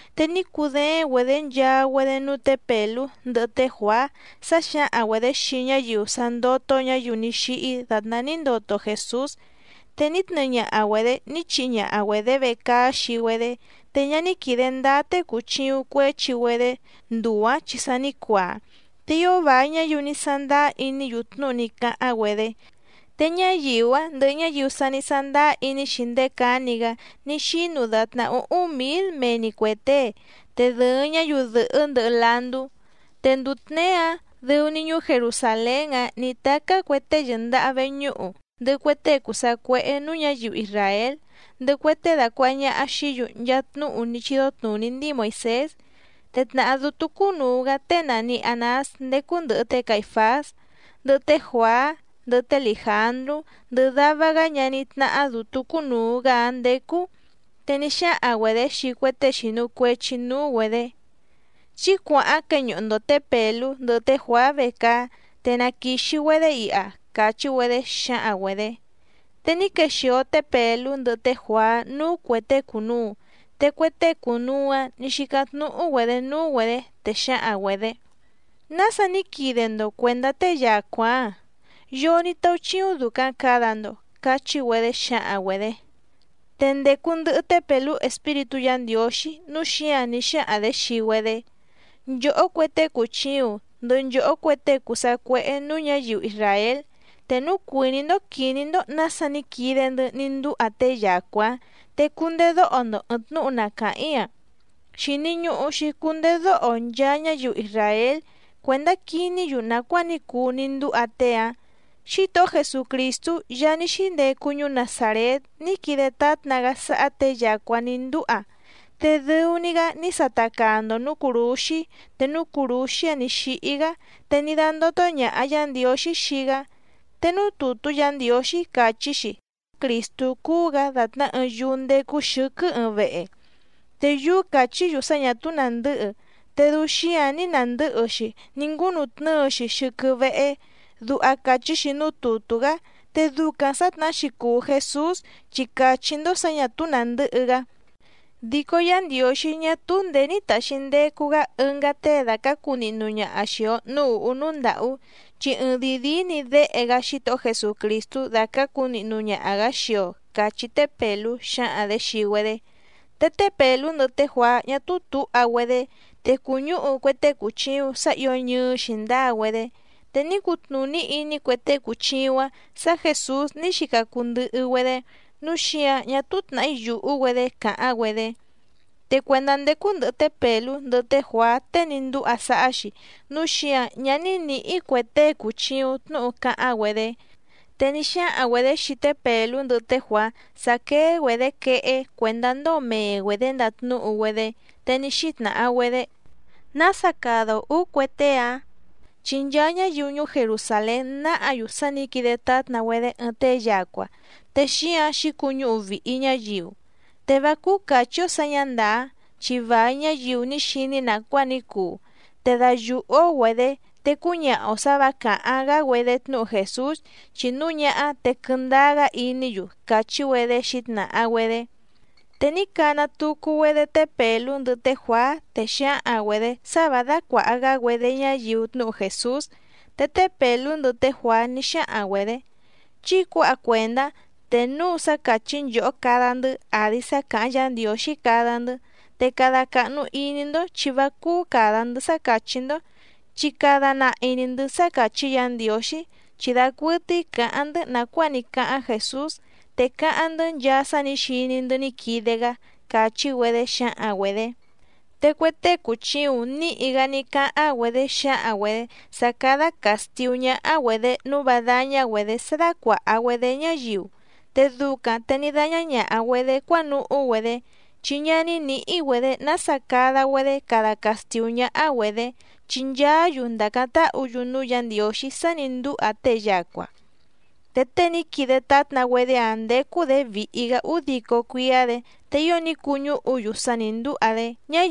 Te ní cudééⁿ‑güedě nchaa‑güedé núú tě Pèlú ndɨhɨ té Juàá sá xǎhaⁿ‑güedě xii ñáyiu sá ndótó ñǎyiu ní xíhí dàtná ní ndoto Jèsús. Te ní tnɨɨ ñaha‑güedě ní chihi ñaha‑güedě vecaá xii‑güedé, te ñá ní quìde ndáá tée cùchiuⁿ cuéchi‑güedé nduu‑ǎⁿ chi sa ní cuaa. Te ío vài ñáyiu ní sándáá iní‑yu tnúhu ní cáháⁿ‑güedé, te ñáyiu‑áⁿ ndɨhɨ ñáyiu sa ní sándáá iní‑xi ndéé cǎni‑gá ní xínu dàtná úhúⁿ mǐl mee‑ni cuè tée, te dɨ̀ɨⁿ ñáyiu dɨ̀hɨ́ ndɨhɨ landú. Te nduu tněé‑áⁿ dɨu‑ni ñuú Jerusàlén‑áⁿ nǐ tacá cue tée yɨ̀ndaha veñúhu, ndɨhɨ cue tée cùu sacuéhé nǔú ñǎyiu isràél ndɨhɨ cue tée dàcuaha ñaha xií‑yu nchaa tnúhu ní chídó tnùní ndíi Moìsés. Te tnàhá dútú cúnùu‑gá tée nàni Anás ndécú ndɨ̀hɨ té Caìfás, ndɨhɨ té Juàá, ndɨhɨ té Lìjandrú ndɨhɨ dava‑gá ñaní tnáhá dǔtú cúnùu‑gá‑áⁿ ndécú. Te ní xáhaⁿ‑güedě xii cue tée xìnu cuechi núú‑güedě: —Chí cuàháⁿ queñuhu‑ndo tě Pèlú ndɨhɨ té Juàá vecaá, te na quìxi‑güedé iha —càchí‑güedé xǎhaⁿ‑güedě. Te ní quexìo té Pèlú ndɨhɨ té Juàá núú cuè tée cùnuu, te cue tée cùnuu‑áⁿ nǐ xícáⁿ tnúhú‑güedě núú‑güedě, te xǎhaⁿ‑güedě: —¿Nása ní quide‑ndo cuèndá tée yacua‑ǎⁿ? ¿Yoo ní táúchíúⁿ dùcaⁿ cada‑ndo? —cachí‑güedé xǎhaⁿ‑güedě. Te ndècu ndɨhɨ té Pèlú Espíritú Yǎ Ndiǒxí, núu xíǎⁿ ní xáhaⁿ‑dě xii‑güedé: —Nchòhó cue tée cùchiuⁿ ndɨhɨ nchòhó cue tée cùu sacuéhé nǔú ñǎyiu isràél, te núu cuìní‑ndó quìní‑ndó nǎsa ní quide‑ndɨ́ ní ndúha tée yacua‑ǎⁿ, te cundedóho‑ndo ɨ̀ɨⁿ tnúhu na càháⁿ‑í‑a. Xìni ñuhu‑xi cundedóho nchaa ñáyiu isràél cuèndá quiní‑yu nàcuáa ní cuu ní ndúha tée‑ǎⁿ. Xítohó Jesucrìstú Yaá ní xíndecu ñuú Nazàrét ní quide tátna‑gá sáhá těe yacua ní ndúha, te dɨu‑ni‑gá ní sata caa‑ndo nǔú cùrúxí te núú cùrúxí‑áⁿ nǐ xíhí‑gá, te ní dándótó ñàha Yá Ndiǒxí xii‑gá. Te núú tùtú Yǎ Ndiǒxí càchí‑xi: “Crìstú cúú‑gǎ dàtná ɨɨⁿ yúú ndécú xɨ̌quɨ́ ɨɨⁿ vehe. Te yúú càchí‑yu sá ñà túú nàndɨ́hɨ, te dɨu xíǎⁿ ní nàndɨ́hɨ‑xi ní ngúnutnɨ́ɨ‑xi xɨ́quɨ́ véhé”, duha càchí‑xi núú tùtú‑gá. Te ducaⁿ sǎtnahá‑xi cùu Jesús, chi càchí‑ndó sǎ ñà túú nàndɨ́hɨ‑gá, dico Yá Ndiǒxí ñá túú ndèé ní tàxi ndecu‑gá ɨngá tée dàcácu nihnu ñaha xìi‑o núú ùhú núú ndàhú, chi ɨɨⁿdìi díí‑ni Déhe‑gá Xítohó Jesucrìstú dacǎcu nihnu ñaha‑gǎ xii‑o —càchí té Pèlú xǎhaⁿ‑dě xii‑güedé. Te té Pèlú ndɨhɨ té Juàá ñá túú tǔha‑güedé, te cùñúhu cue tée cùchiuⁿ sá ǐo ñɨɨ́ xǐndáa‑güedé. Te ní cutnùní iní cue tée cùchiuⁿ‑áⁿ sǎ Jèsús ní xica cuu ndɨhɨ‑güedé, núu xíǎⁿ ñá túú tnàhí yùhú‑güedé càháⁿ‑güedé. Te cuèndá ndécú ndɨ̀hɨ té Pèlú ndɨhɨ té Juàá tée ní ndúha sáhá‑xi, núu xíǎⁿ ñá ní nǐhí cue tée cùchiuⁿ tnúhu cáháⁿ‑güedé. Te ní xáhaⁿ‑güedě xii té Pèlú ndɨhɨ té Juàá sá quéé‑güedě quehé cuèndá ndóo mee‑güedě ndatnúhu‑güedé. Te ní xítnàha‑güedé: —¿Nása cada‑o ǔú cue tée‑ǎⁿ?, chi nchaa ñáyiu ñuú Jerusàlén náhǎ‑yu sá nǐ quide tátna‑güedé ɨɨⁿ tée yacua, te xíǎⁿ xǐcuñúhu vìhi ñáyiu. Te vá cúú càchí‑ó sǎ ñǎ ndàá, chi vài ñáyiu ní xiní nàcuáa ní cuu. Te dayùhú‑ó‑güedě te cúñaha‑o sǎ vǎ càháⁿ‑gá‑güedé tnúhu Jèsús, chi núu ñáhá te quɨndáá‑gá iní‑yu —càchí‑güedé xǐtnàha‑güedé. Te ní cana tucu‑güedé té Pèlú ndɨhɨ té Juàá, te xǎhaⁿ‑güedě sá vǎ dácuàha‑gá‑güedé ñáyiu tnúhu Jèsús. Te té Pèlú ndɨhɨ té Juàá ní xáhaⁿ‑güedě: —Chí cuǎha cuèndá, te núu sá càchí nchòhó cada‑ndɨ́ àdi sá càháⁿ Yǎ Ndiǒxí cada‑ndɨ́. Te cada càhnu iní‑ndó chi vá cúú càda‑ndɨ́ sá càchí‑ndó, chi cada nahi‑ni‑ndɨ̌ sá càchí Yǎ Ndiǒxí. Chi dacuɨtɨ́í cǎháⁿ‑ndɨ́ nàcuáa ní cáháⁿ Jèsús, te cáháⁿ‑ndɨ́ nchaa sá nǐ xiní‑ndɨ́ ní quide‑gá —càchí‑güedé xǎhaⁿ‑güedě. Te cue tée cùchiuⁿ níhi‑gá ní cáháⁿ‑güedé xǎhaⁿ‑güedě sá cádá càstiú ñáhá‑güedě nǔu vá dáñá‑güedě sá dácuàha‑güedé ñáyiu. Te ducaⁿ te ní dáñá ñàha‑güedé cuánuhú‑güedé, chi ñá ní nǐhí‑güedě nása cada‑güedé cada castìú ñáhá‑güedě, chi nchaá‑yu ndàcáⁿ táhǔ‑yu núú Yǎ Ndiǒxí sá nǐ ndúha tée yacua. Te tée ní quide tátna‑güedé‑áⁿ ndécú‑dě vìhi‑gá údico cuíá‑dě, te ío ní cuñúhu‑yu sá nǐ ndúha‑dé.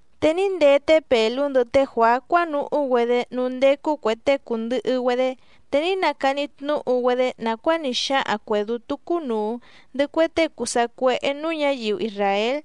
Te ní ndee té Pèlú ndɨhɨ té Juàá cuánuhú‑güedé núú ndécú cuè tée cùndɨhɨ‑güedé, te ní nacani tnúhu‑güedé nàcuáa ní xáhaⁿ cuè dútú cúnùu ndɨhɨ cue tée cùu sacuéhé nǔú ñǎyiu isràél.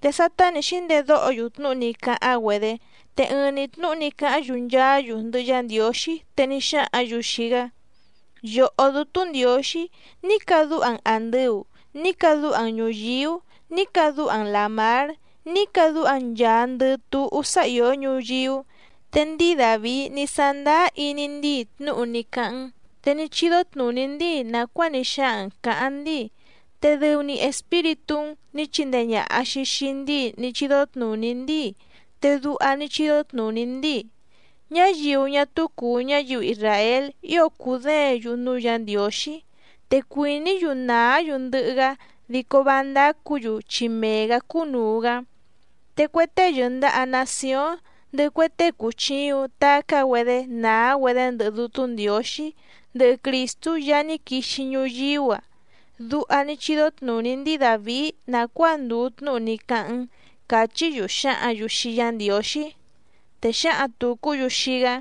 Te sátá nǐ xíndedóho‑yu tnúhu ní cáháⁿ‑güedé, te ɨɨⁿ‑ni tnúhu ní cáháⁿ‑yu nchaá‑yu ndɨhɨ Yá Ndiǒxí, te ní xáhǎⁿ‑yu xii‑gá: —Yòhó Dútú Ndiǒxí, ní cadúha‑n àndɨu, ní cadúha‑n ñùyíú, ní cadúha‑n làmár, ní cadúha‑n nchàandɨ túhú sá ìó ñuyíú. Te ndíi Dàvií ní sándáá iní ndíi tnúhu ní cáháⁿ‑n, te ní chídó tnùní ndíi nàcuáa ní xáhaⁿ‑n cǎháⁿ ndíi, te dɨu‑ni Espíritú‑n nǐ chindee ñàha‑xi xii ndíi ní chídó tnùní ndíi, te duha ní chídó tnùní ndíi: Ñáyiu ñá túú cùu ñáyiu isràél ío cùdéěⁿ‑yu núú Yǎ Ndiǒxí, te cuìní‑yu nàá‑yu ndɨhɨ‑gá, dico vá ndácǔ‑yu chi mee‑gǎ cúnùu‑gá. Te cue tée yɨ̀ndaha nacióⁿ ndɨhɨ cue tée cùchiuⁿ tacá‑güedé nàá‑güedé ndɨhɨ Dútú Ndiǒxí ndɨhɨ Crìstú Yaá ní quixi ñuyíú‑a. Duha ní chídó tnùní ndíi Dàvií nàcuáa ndùu tnúhu ní cáháⁿ‑n —càchí‑yu xǎhǎⁿ‑yu xii Yá Ndiǒxí. Te xǎhaⁿ tùcú‑yu xii‑gá: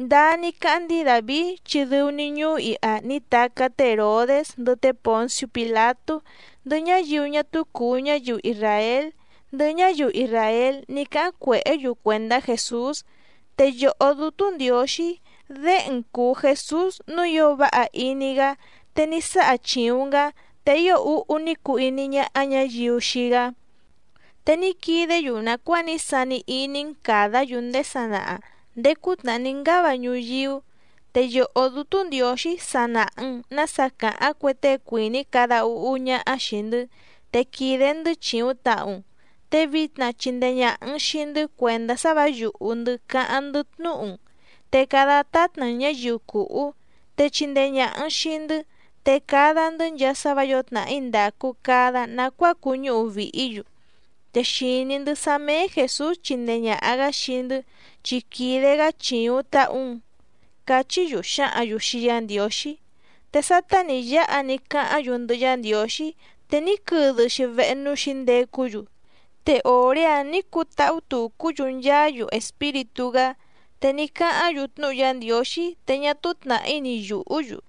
—Ndáá ní cáháⁿ ndíi Dàvií chi dɨu‑ni ñuú iha ní tacá té Hèrodés ndɨhɨ té Pònciú Pìlatú ndɨhɨ ñáyiu ñá túú cùu ñáyiu isràél ndɨhɨ ñáyiu isràél ní cáháⁿ cuèhé‑yu cuèndá Jèsús. Te Yòhó Dútú Ndiǒxí, Déhe‑n cùu Jesús nǔu ío váha iní‑gá, te ní sáha chìuⁿ‑n‑gá, te ío úhú ní cuu iní ñáhá ñǎyiu xii‑gá. Te ní quidé‑yu nàcuáa ní sani iní‑n càdá‑yu ndéé sanaha, ndéé cútnàhá ní ngáva ñuyíú. Te Yòhó Dútú Ndiǒxí sa nàha‑n nása càháⁿ cue tée cuìní cada úhú ñáhá xìi‑ndɨ́. Te quìde‑ndɨ́ chìuⁿ tahu‑n, te vitna chindee ñàha‑n xii‑ndɨ́ cuèndá sá vǎ yùhú‑ndɨ́ cáháⁿ‑ndɨ́ tnúhu‑n. Te cada tátna‑n ñǎyiu cùhú, te chindee ñàha‑n xii‑ndɨ́, te cada‑ndɨ́ nchaa sá vǎ yǒo tnàhí ndàcu cada nacuáa cuñúhu vìhí‑yu. Te xìní‑ndɨ́ sá méé Jèsús chindee ñàha‑gá xii‑ndɨ́, chi quìde‑gá chìuⁿ tahu‑n —cachí‑yu xǎhǎⁿ‑yu xii Yá Ndiǒxí. Te sátá nǐ yáha ní cáháⁿ‑yu ndɨhɨ Yá Ndiǒxí, te ní quɨdɨ‑xi vehe núú xǐndecú‑yu, te òré‑áⁿ nǐ cutáhú tucú‑yu nchaá‑yu Espíritú‑gá. Te ní cáháⁿ‑yu tnúhu Yá Ndiǒxí, te ñá túú tnàhí ni yùhú‑yu.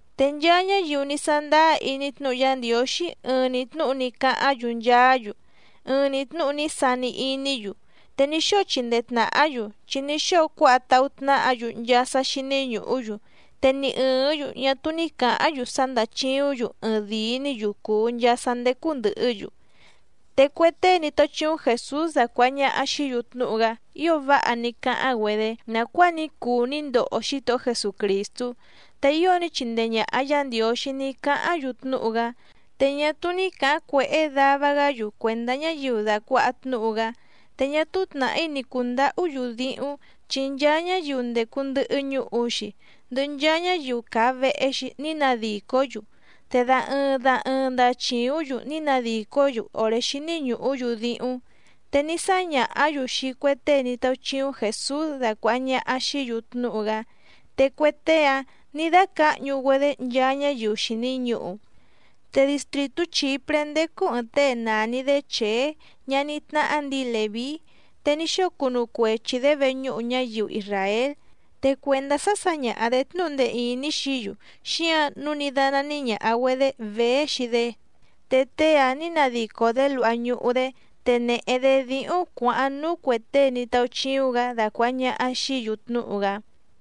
Te nchaa ñáyiu ní sándáá iní tnúhu Yá Ndiǒxí ɨɨⁿ‑ni tnúhu ní cáháⁿ‑yu nchaá‑yu. Ɨɨⁿ‑ni tnúhu ní sani iní‑yu, te ní xóo chindee tnàhá‑yu chi ní xóo cuáha táhú tnáhǎ‑yu nchaa sá xíní ñùhú‑yu, te ni ɨ̀ɨ́ⁿ‑yu ñá túú ní cǎháⁿ‑yu sá ndàchiúⁿ‑yu ɨɨⁿdìi‑ní‑yu cùu nchaa sá ndécú ndɨ̀hɨ́‑yu. Te cue tée ní táúchíúⁿ Jèsús dacuàha ñaha xií‑yu tnúhu‑gá ío váha ní cáháⁿ‑güedé nàcuáa ní cuu ní ndoho Xítohó Jesucrìstú. Te ío ní chindee ñàha Yá Ndiǒxí ní cáháⁿ‑yu tnúhu‑gá, te ñá túú ní cǎháⁿ cuèhé dava‑gá‑yu cuèndá ñáyiu dàcuaha tnúhu‑gá. Te ñá túú tnàhí ni cùndahú‑yu díhúⁿ, chi nchaa ñáyiu ndècu ndɨhɨ ñuhu‑xi, ndɨhɨ nchaa ñáyiu càa vehe‑xi ní nadìcó‑yu, te da ɨɨⁿ da ɨɨⁿ ndachìúⁿ‑yu ní nadìcó‑yu òré xíní ñùhú‑yu díhúⁿ. Te ní sáñàhá‑yu xii cue tée ní táúchíúⁿ Jèsús dacuàha ñaha xií‑yu tnúhu‑gá, te cue tée‑áⁿ nǐ dácǎhñu‑güedé nchaa ñáyiu xìni ñuhu. Te distrìtú Chìpré ndécú ɨ̀ɨⁿ tée nàni‑dé Chèé ñaní tnáhá ndǐi Lèví, te ní xóo cunu cuechi‑dě veñúhu ñáyiu isràél. Te cuèndá sá sǎñaha‑dě tnúhu ndee ìní xií‑yu, xíǎⁿ nǔu ní dánání ñàha‑güedé Vèé xii‑dé. Te tée‑áⁿ nǐ nadico‑dě luha ñuhu‑dé, te nèhe‑dé díhúⁿ cuǎháⁿ núú cuè tée ní táúchíúⁿ‑gǎ dacuàha ñaha xií‑yu tnúhu‑gá.